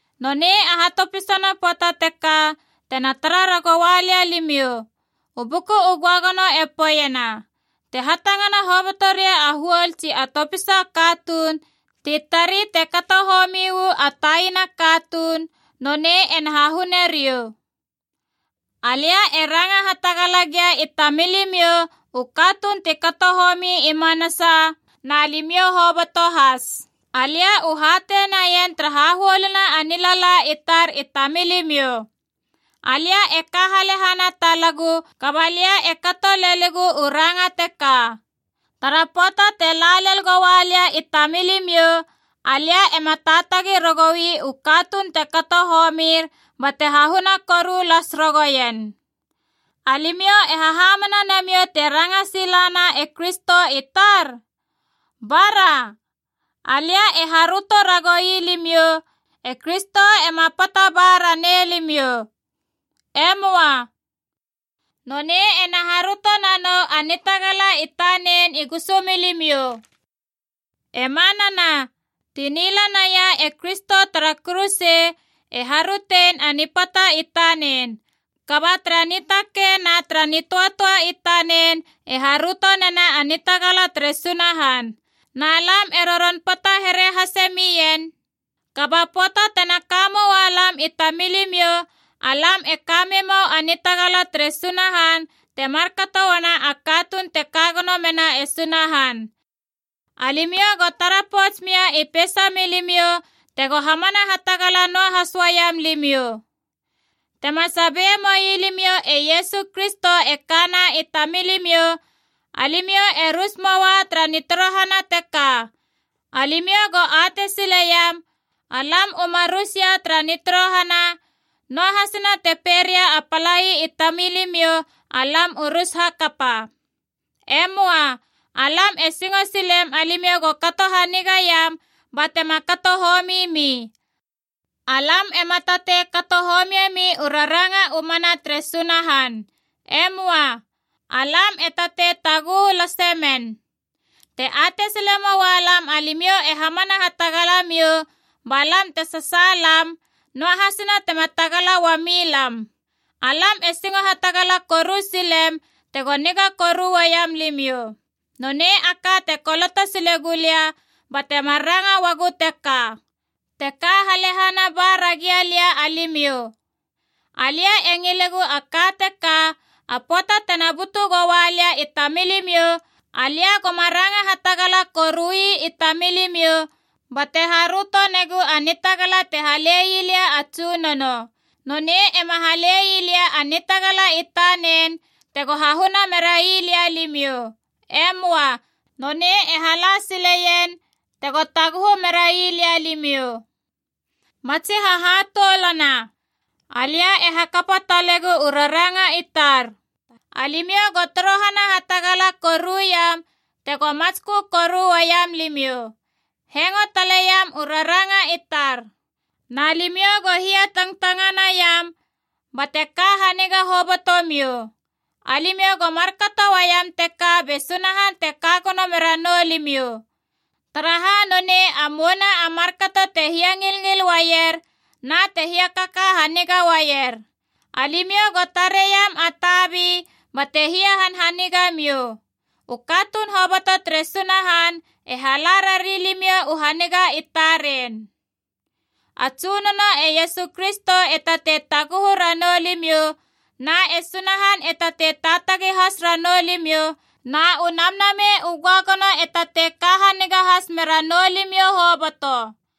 Nonei a hatopisana pöata teka tena tara ragoua lia limiou. U Buku u Göagono e poeiena, Te hatangana hoboto ria a huol tsi a topisa a katuun ti tari te kato homi uu a taina a katuun, nonei ena hahune riou. Alia e ranga hatagala gia i tamilimiou u katuun ti kato homi i manasa, na limiou hoboto has. Alia u hatei naien tara hahuoluna a nilala i tar i tamilimiou. Alia e ka halehana talagu, kaba lia e kato lelegu u ranga teka: tara pöata te la lel goua lia i tamilimiou, alia ema taatagi ragoui u katuun te kato homir bate hahuna koru las ragouen. Alimiou e hahamana namiou te ranga silana e Kristo i tar? Bara. Alia e haröto ragoui limiou, e Kristo ema pata ba ranei limiou. E möa. Nonei ena haröto nanou a nitagala i tanen i gusu milimiou. E manana, ti nila naia e Kristo tara kuruse e harötein a nipata i tanen, kaba tara nitakei na nitöatöa i tanen, e haröto nena a nitagala tere Sunahan. Na lam e roron pata here hase mien, kaba pöata tena ka moua lam i tamilimiou, alam e ka memou a nitagala tere Sunahan te markato uana a katuun te ka gono mena e Sunahan. Alimiou go tara pouts mia i peisa milimiou tego hamana hatagala noahas uaiam limiou. Tema sabie moi limiou e Iesu Kristo e kana i tamilimiou, alimiou e rus moa tara nitorohana teka. Alimiou go atei sileiam alam u ma rus ia tara nitorohana, noahasina te pei ria a palai i tamilimiou alam u rus hakapa. E möa. Alam e singo silem alimiou go kato hanigaiam batema kato homi mi. Alam ema tatei kato homiemi u raranga u mana tere Sunahan. E möa. Alam e tatei taguhu lase men. Te atei sile moua lam alimiou e hamana hatagala miou, ba lam te sasaalam, noahasina tema tagala uami lam. Alam e singo hatagala koru silem tego niga koru uaiam limiou. Nonei a ka te koloto sile gulia bate mar ranga uagu teka, te ka halehana ba ragia lia alimiou. Alia e ngilegu a ka teka: a pöata tena butu goua lia i tamilimiou, alia goma ranga hatagala korui i tamilimiou bate haröto negu a nitagala te hale ii lia a Tsunono. Nonei ema hala sile ii lia a nitagala i tanen tego hahuna merai lia limiou. E möa. Nonei e hala sileien tego taguhu merai lia limiou. Matsi hahatoulana, alia e hakapa talegu u raranga i tar. Alimiou go torohana hatagala koruiam tego matskö koru uaiam limiou. Hengo taleiam u raranga i tar. Na limiou go hia tangtanganaiam bate ka haniga hobotomiou. Alimiou go markato uaiam teka be Sunahan te ka gono mera nou limiou, taraha nonei a mouna a markato te hiangilngil uaier na te hiakaka haniga uaier. Alimiou go tareiam a tabi bate hiahanhaniga miou. U katuun hoboto tere Sunahan e hala rari limiou u haniga i taren. A Tsunono e Iesu Kristo e tatei taguhu ranou limiou, na e Sunahan e tatei taatagi has ranou limiou, na u Namnamei u Göagono e tatei ka haniga has mera noulimiou hoboto.